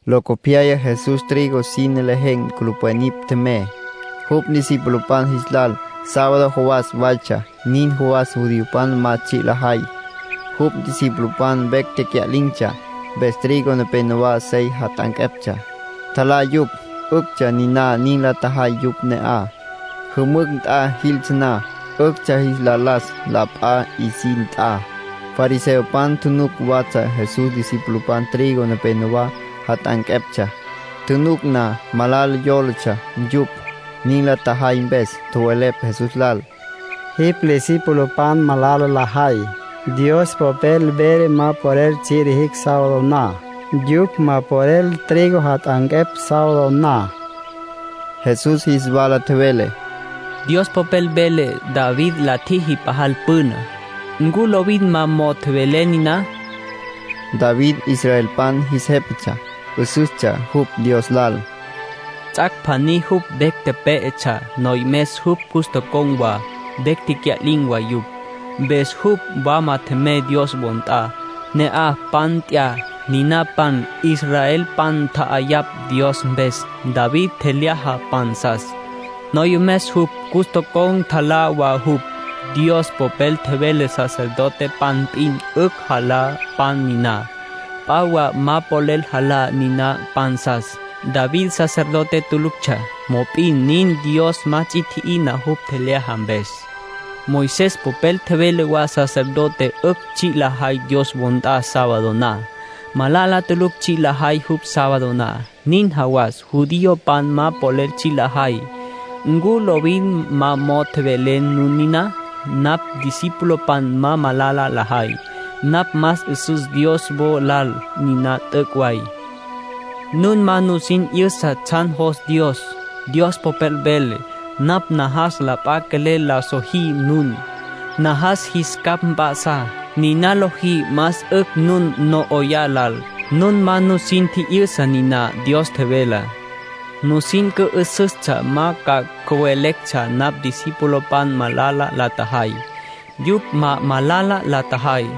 Locopyaya Jesús trigo sine lejen̈ culupwen nipj tjemey, jupj discipulopan jis lal. Sábado jawas waytsja, nin jawas judiopan ma tsji' lajay. Jupj discipulopan vecj tecya'lin̈tsja, mpes trigo nepenowá sey jat'anqueptsja. Tjalá yupj. ('Üctsja niná nin la tjajay yupj ne'aj. Jümücj nt'a jiltsja na, 'üctsja jis la las la p'a 'isin nt'a.) Fariseopan tjunuc watsja Jesús discipulopan trigo nepenowá jat'anqueptsja. Tjunuc na, malala yólatsja yupj, nin la tjajay mpes. Tjowelepj Jesús lal: —Jipj discipulopan malala lajay. Dios Popel vele cupj ma polel tsji' lijicj sábado na. Yupj ma polel trigo jat'anquepj sábado na —tjowelepj yupj. Jesús jis wala tjevele: —Dios Popel vele David la tjijá pajal püna. ¿Ncu lovin ma mo'o tjowelé niná? (David israelpan jis jépatsja. 'Üsüstsja jupj Dios lal.) Ts'ac' pjaní jupj vecj pé'etsja. Noyomes jupj cus tocon̈ wa, vecj tecya'lin̈ wa yupj. Mpes jupj wama tjemey Dios wo nt'a. Ne'aj pan nt'ya. Niná pan israelpan tja'ayapj Dios mpes. David tjelyaja pansas. Noyomes jupj cus tocon̈ tjalá wa yupj. Dios Popel tjevele sacerdotepan p'in 'ücj jalá pan niná. P'a wa ma polel jalá niná pansas. David sacerdote tuluctsja, mop'in nin Dios ma ts'i tji'ina jupj tjelyaja mpes. Moisés popel vele wa sacerdotepan 'ücj tsji' lajay Dios wo nt'a sábado na. Malala tulucj tsji' lajay yupj sábado na, nin jawas judiopan ma polel tsji' lajay. ¿Ncu lovin ma mo'o tjowelé nun niná? Napj discipulopan ma malala la tjajay. Napj más 'üsüs Dios wo lal. Niná t'üc' way. Nun ma nusin 'yüsa tsjan jos Dios. Dios Popel vele: ‘Napj najas la p'a quelel la sojí nun. Najas jis capj mp'a'sá. Niná lojí más 'ücj nun no 'oyá lal.’ Nun ma nusin tji'yüsa niná Dios tjevelá. Nusin cü'üsüstsja, ma ca cüweletsja napj discipulopan malala la tjajay. Yupj ma malala la tjajay.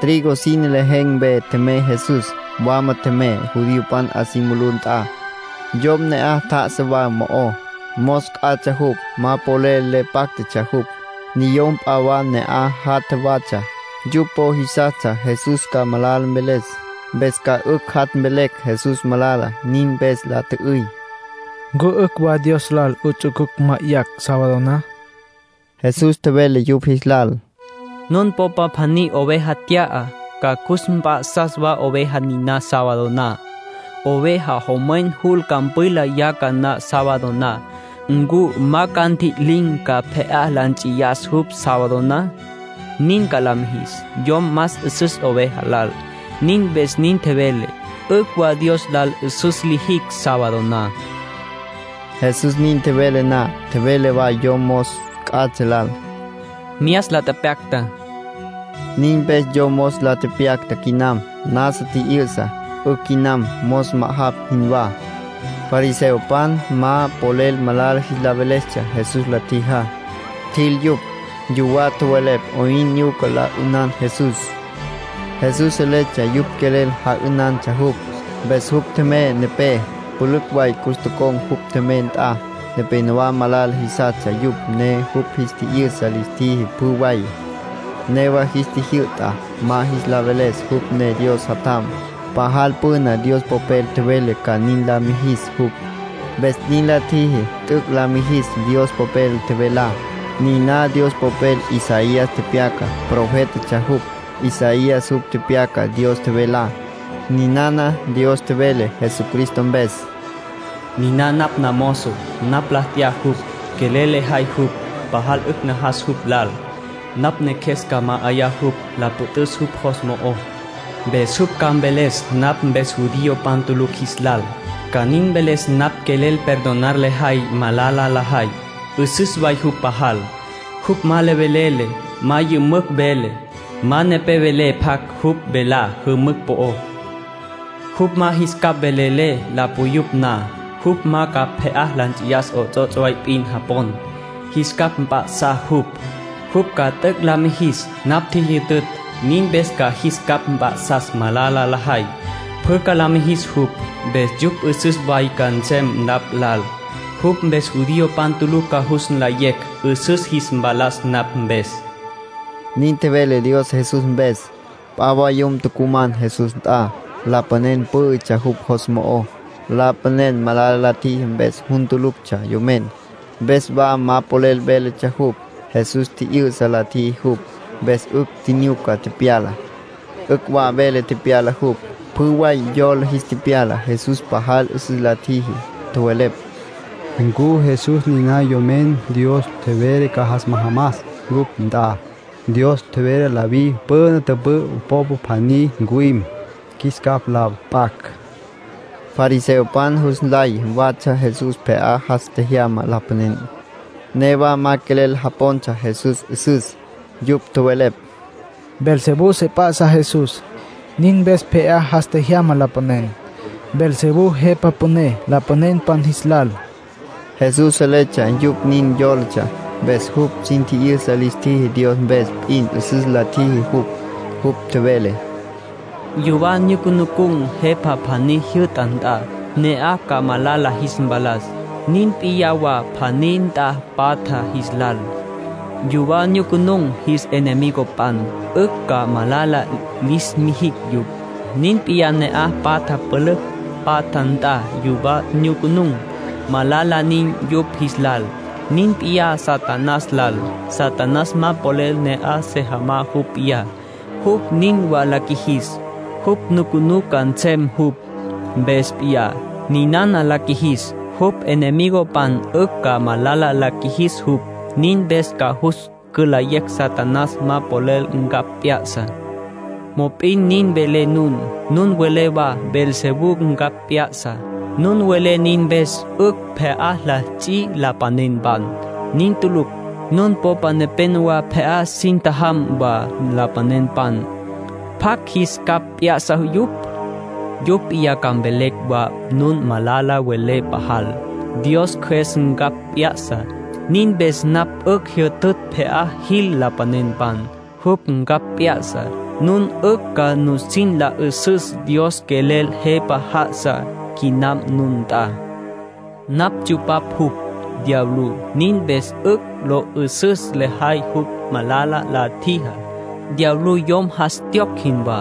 Trigo sine lejen̈ mpe tjemey Jesús. Wama tjemey, judiopan 'a si mulú nt'a. Yom ne'aj tjá'asa wa mo'ó, mos c'atsja jupj. Ma polel le páctatsja jupj. Niyom p'a wa ne'aj jatja watsja. Yupj po jisastsja Jesús ca malala mveles, mpes ca 'ücj jat' mvelecj Jesús malala. Nin mpes la tjü'üy: —¿Ncu 'ücj wa Dios lal 'uts'ucucj ma'ayacj sábado na? Jesús tjevele yupj jis lal: —Nun popa pjaní oveja tya'a, ca cus mp'a'sas wa oveja niná sábado na. Oveja jomwen jul campwila yaca na sábado na ¿ncu ma ca ntji'lim, ca pje'á la nts'iyas jupj sábado na? Nin ca la mijis. Yom más 'üsüs oveja lal. Nin mpes nin velé, 'ücj wa Dios lal 'üsüs lijicj sábado na. Jesús nin tjevele na, tjevele wa yom mos c'atsja lal: —Myas la tepyacta. Nin mpes yom mos la tepyacta quinam. Nasa tji'yü'sa. 'Ücj quinam, mos ma'ajapj jinwá. Fariseopan ma polel malala jis la velestsja Jesús la tjijá. Tjil yupj. Yuwá tjowelepj 'oyn nyuca la 'ünan Jesús. Jesús seletsja yupj quelel ja'ünantsja jupj, mpes jupj tjemey nepé. Pülücj way cus tocon̈ jupj tjemey nt'a. Nepénowa malala jisastsja yupj, ne jupj jis tji'yü'sa lis tjiji pjü way. Newa jis tjijyü'ta ma jis la veles jupj ne Dios Jatjam. Pajal püna Dios Popel tjevele ca nin la mijis jupj. Mpes nin la tjiji t'üc' la mijis Dios Popel tjevelá. Niná Dios Popel Isaías tepyacá. Profétatsja jupj, Isaías. Jupj tepyaca Dios tjevelá. Ninana Dios tjevele Jesucristo mpes: “Niná napj namozo. Napj la t'ya jupj. Quelel lejay jupj. Pajal 'ücj najas jupj lal. Napj Neqjues ca ma'ayá jupj, la püt'üs jupj jos mo'ó. Mpes jupj ca mveles napj mpes judiopan tulucj jis lal. Ca nin mveles napj quelel perdonar lejay malala lajay. 'Üsüs way jupj pajal. Jupj ma le velele. Ma yümücj vele. Ma nepé vele pjac jupj velá jümücj po'ó. Jupj ma jis capj velele la puyupj na. Jupj ma ca pje'á la nts'iyas 'ots'ots' way p'in japon. Jis capj p'ya'sa jupj. Jupj ca t'üc' la mijis napj tjijyütütj. Nin mpes ca jis capj mp'a'sas malala lajay. Pjü ca la mijis jupj, mpes yupj 'üsüs way ca nsem napj lal. Jupj mpes judiopan tulucj ca jus nlayecj 'üsüs jis mpalas napj mpes.” Nin tjevele Dios Jesús mpes. P'a wa yom tucuman Jesús nt'a. Lapanen pǘ'ütsja jupj jos mo'ó. Lapanen malala la tjiji mpes jun tuluctsja yomen. Mpes wa ma polel véletsja jupj. Jesús tji'yü'sa la tjiji jupj, mpes 'ücj tjinyuca tepyala, 'ücj wa vele tepyala jupj. Pjü way yola jis tepyala Jesús pajal 'üsüs la tjiji. Tjowelepj: “¿Ncu Jesús niná Yomen Dios tjevele ca jas majamas cupj nt'a? Dios tjevele David püna tüpü'ü popa pjaní ncuwim, qjuis capj la p'acj.” Fariseopan jus nlay watsja Jesús pje'á jas tjejyama lapanen. Newa ma quelel japontsja Jesús 'üsüs. Yupj tjowelepj: “Beelzebú se p'á'satsja Jesús. Nin mpes 'ücj pje'á jas tjejyama lapanen. Beelzebú jepa püné lapanenpan jis lal.” Jesús seletsja yupj nin yólatsja. Mpes jupj sin tji'yüsa lis tjiji Dios mpes p'in 'üsüs la tjiji jupj. Jupj tjevele: “Yuwá nyucunun̈ jepa pjaní jyü'ta nt'a, ne'aj ca malala jis mpalas. Nin p'iyá wa pjaní nt'a patja jis lal. Yuwá nyucunun̈, jis enemigopan 'ücj ca malala lis mijicj yupj. Nin p'iyá ne'aj patja pülücj patja nt'a yuwá nyucunun̈, malala nin yupj jis lal. Nin p'iyá Satanás lal. Satanás ma polel pje'á se jamá jupj p'iyá. Jupj nin wa la qjuijis, jupj nucunú ca nsem jupj mpes p'iyá. Ninana la qjuijis, jupj enemigopan 'ücj ca malala la qjuijicj jupj. Nin mpes ca jus cülayé Satanás ma polel ncapj p'ya'sa. Mop'in nin welé nun. Nun welé wa Beelzebú ncapj p'ya'sa. Nun welé nin mpes 'ücj pje'á li ts'i lapanenpan. Nin tulucj. Nun popa nepenowá pje'á sin tjajam wa lapanenpan. ¿Pjacj jis capj p'ya'sa yupj? Yupj p'iyá ca mvelecj wa nun malala welé pajal. Dios Cjües ncapj p'ya'sa. Nin mpes napj 'ücj jyütütj pje'á jil lapanenpan. Jupj ncapj p'ya'sa, nun 'ücj ca nusin la 'üsüs Dios quelel Jepa já'asa quinam nun nt'a. ”Napj tsyupapj jupj, diablú. Nin mpes 'ücj lo 'ü'süs lejay jupj malala la tjijá. Diablú yom jas tjiyocj jinwá.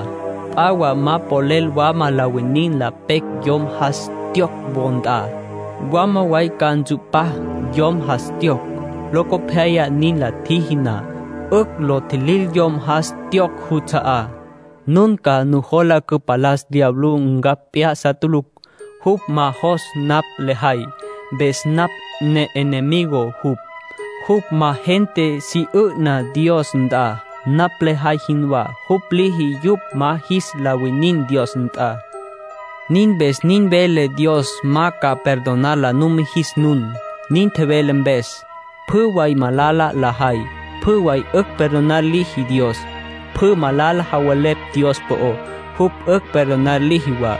P'a wa ma polel wama la winin la pecj yom jas tjiyocj wo nt'a. Mwalá way ca ntsu'pá yom jas tjiyocj. Locopyaya, nin la tjiji na, 'ücj lo tjilil yom jas tjiyocj juts'a'á. ”Nun ca nujola cüpalas diablú ncapj p'ya'sa tulucj. Jupj ma jos napj lejay, mpes napj ne'enemigo jupj. Jupj ma gente cyuna Dios nt'a, napj lejay jinwá. Jupj liji yupj ma jis la winin Dios nt'a. ”Nin mpes nin velé Dios ma ca perdonar la numijis nun, nin tjowelé mpes. Pjü way malala lajay, pjü way 'ücj perdonar liji Dios. Pjü malala javelepj Dios po'ó, jupj 'ücj perdonar liji wa.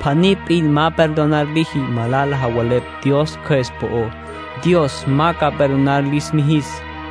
Pjaní p'in ma perdonar liji. Malala javelepj Dios Cjües po'ó, Dios ma ca perdonar lis mijis.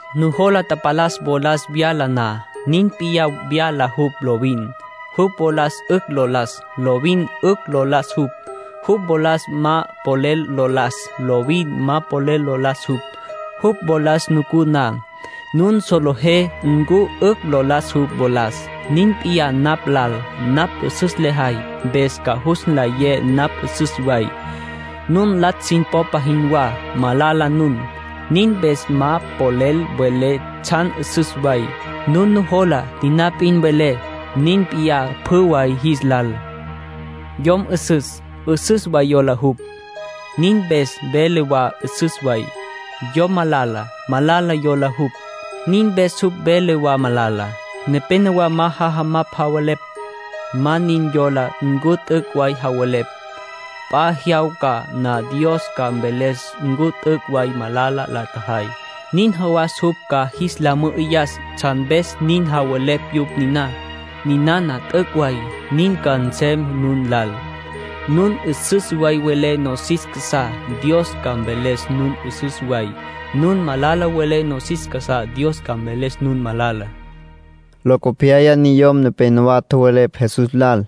”Nujola tapalas wolas vyala na, nin p'iyá vyala jupj lovin. Jupj wolas 'ücj lo las, lovin 'ücj lo las jupj. Jupj wolas ma polel lo las, lovin ma polel lo las jupj. Jupj wolas nucú na, nun solejé ncu 'ücj lo las jupj wolas. Nin p'iyá napj lal. Napj 'üsüs lejay, mpes ca jus nlayé napj 'üsüs way. Nun latsj sin popa jinwá. Malala nun. Nin mpes ma polel welé tsjan 'üsüs way. Nun nujola, niná p'in welé. Nin p'iyá pjü way jis lal. Yom 'üsüs, 'üsüs wa jola jupj. Nin mpes vele wa 'üsüs way. Yom malala, malala jola jupj. Nin mpes jupj vele wa malala. Nenéyawa ma jajamapj javelepj. Ma nin yola ncu t'üc' way javelepj. P'a jyawca na Dios ca mveles ncu t'üc' way malala la tjajay. Nin jawas jupj ca jis la mü'üyas tsjan mpes nin tjowelepj yupj niná. Ninana t'üc' way. Nin ca nsem nun jilal. Nun 'üsüs way welé nosis casá, Dios ca mveles nun 'üsüs way. Nun malala welé nosis casá, Dios ca mveles nun malala”, nin tjevele Jesús. Locopyaya niyom nepenowá tjowelepj Jesús lal,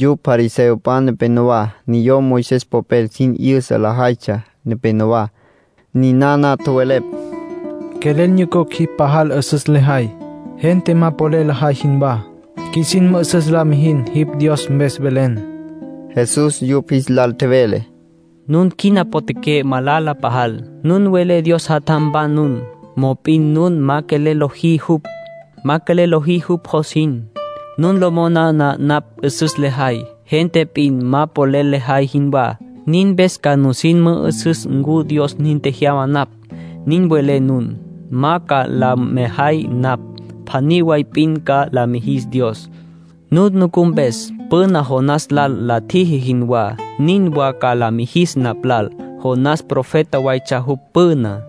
yupj fariseopan nepenowá, niyom Moisés popel sin 'yüsa lajaytsja nepenowá. Ninana tjowelepj: —Quelel nyucucj jipj pajal 'üsüs lejay, gente ma polel lajay jinwá. Qjuisin mü'üsüs la mijin jipj Dios mpes velen. Jesús yupj jis lal tjevele: —Nun quina potjaqué malala pajal. Nun welé Dios jatjampan nun, mop'in nun ma quelel lojí jupj. Ma quelel lojí jupj jos jin. Nun lo moná napj 'üsüs lejay, gente p'in ma polel lajay jinwá. Nin mpes ca nusin mü'üsüs ncu Dios nin tjejyama napj, nin welé nun. Ma ca la mejay napj. Pjaní way p'in ca la mijis Dios, nun nucú mpes. Püna Jonás lal la tjiji jinwá, nin wa ca la mijis napj lal. Jonás profeta waytsja jupj püná.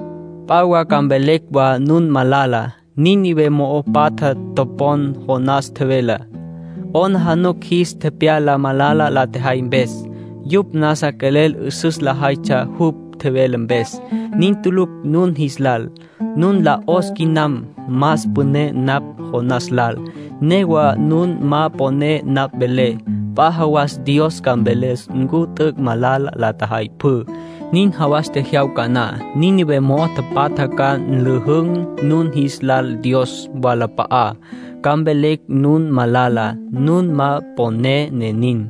P'a wa ca mvelecj wa nun malala. Nínive mo'o tapatja topon Jonás tjevelá. 'Aplijila jis tepyala malala la tjajay mpes. Yupj nasa quelel 'üsüs lajaytsja jupj tjevele mpes. Nin tulucj nun jis lal. Nun lal 'os quinam. Más püné napj Jonás lal. Newa nun ma poné napj velé. P'a jawas Dios ca mveles ncu t'üc' malala la tjajay pjü. Nin jawas tjejyawca na, Nínive mo'o tapatja ca nlüjün̈ nun jis lal Dios wolap'a'á, ca mvelecj nun malala. Nun ma poné, ne nin.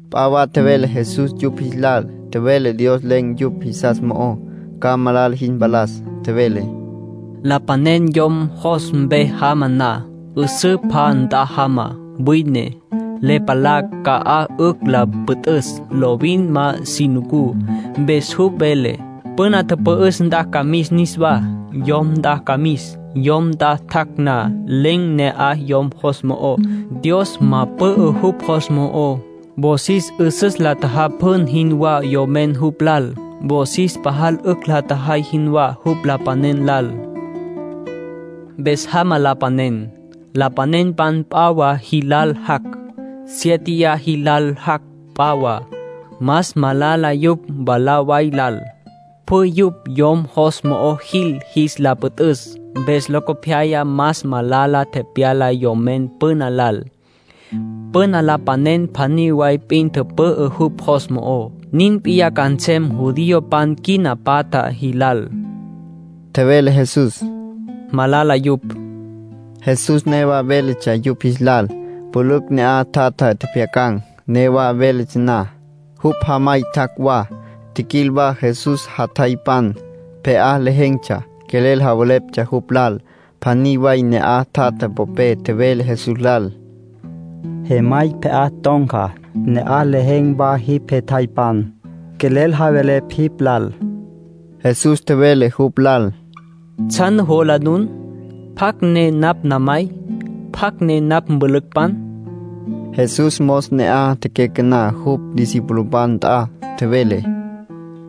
P'a wa tjevele Jesús yupj jis lal. Tjevele Dios len̈ yupj jisas mo'ó, ca malala jis mpalas. Tjevele: —Lapanen yom jos mpe jama na, 'üsǘ pja nt'a jama, wine. Le palá ca'aj 'ücj la püt'üs. Lovin ma si nucú. Mpes jupj vele: ‘Püna tüpü'üs nt'a ca mis niswá. Yom nt'a ca mis.’ Yom nt'a tjac' na, len̈ ne'aj yom jos mo'ó. Dios ma pü'ü jupj jos mo'ó. Wosis 'üsüs la tjajapjun jinwá yomen jupj lal. Wosis pajal 'ücj la tjajay jinwá jupj lapanen lal. Mpes jama lapanen. Lapanenpan p'a wa jilal jac'. Siéteya jilal jac' p'a wa. Más malala yupj mwalá way lal. Pjü yupj yom jos mo'o jil jis la püt'üs. Mpes locopyaya más malala tepyala yomen püna lal. Püna lapanen pjaní way p'in tüpü'ü jupj jos mo'ó. Nin p'iyá ca nsem judiopan quina patja jilal —tjevele Jesús—. Malala yupj. Jesús newa véletsja yupj jis lal. Pülücj ne'aj tjatja tjepjyacan̈. Newa véletsja na, jupj jamay tjac' wa. Tjiquil wa Jesús jatjaypan. Pje'á lejen̈tsja. Quelel javeleptsja jupj lal. Pjaní way ne'aj tjatja popé tjevele Jesús lal: —Jemay pje'á ton̈ca. Ne'aj lejen̈ wa jipj jetjaypan. Quelel javelepj jipj lal. Jesús tjevele jupj lal: —¿Tsjan nujola nun? ¿Pjacj ne napj namay? ¿Pjacj ne napj mpülücpan? Jesús mos ne'aj tecyacaná jupj discipulopan nt'a. Tjevele: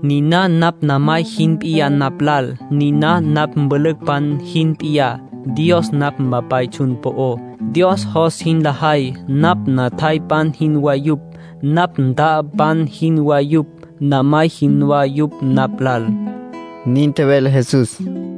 —Niná napj namay jin p'iyá napj lal. Niná napj mpülücpan jin p'iyá. Dios napj Mpapay tsjun po'ó. Dios jos jin lajay, napj natjaypan jinwá yupj, napj nta'apan jinwá yupj, namay jinwá yupj napj lal —nin tjevele Jesús.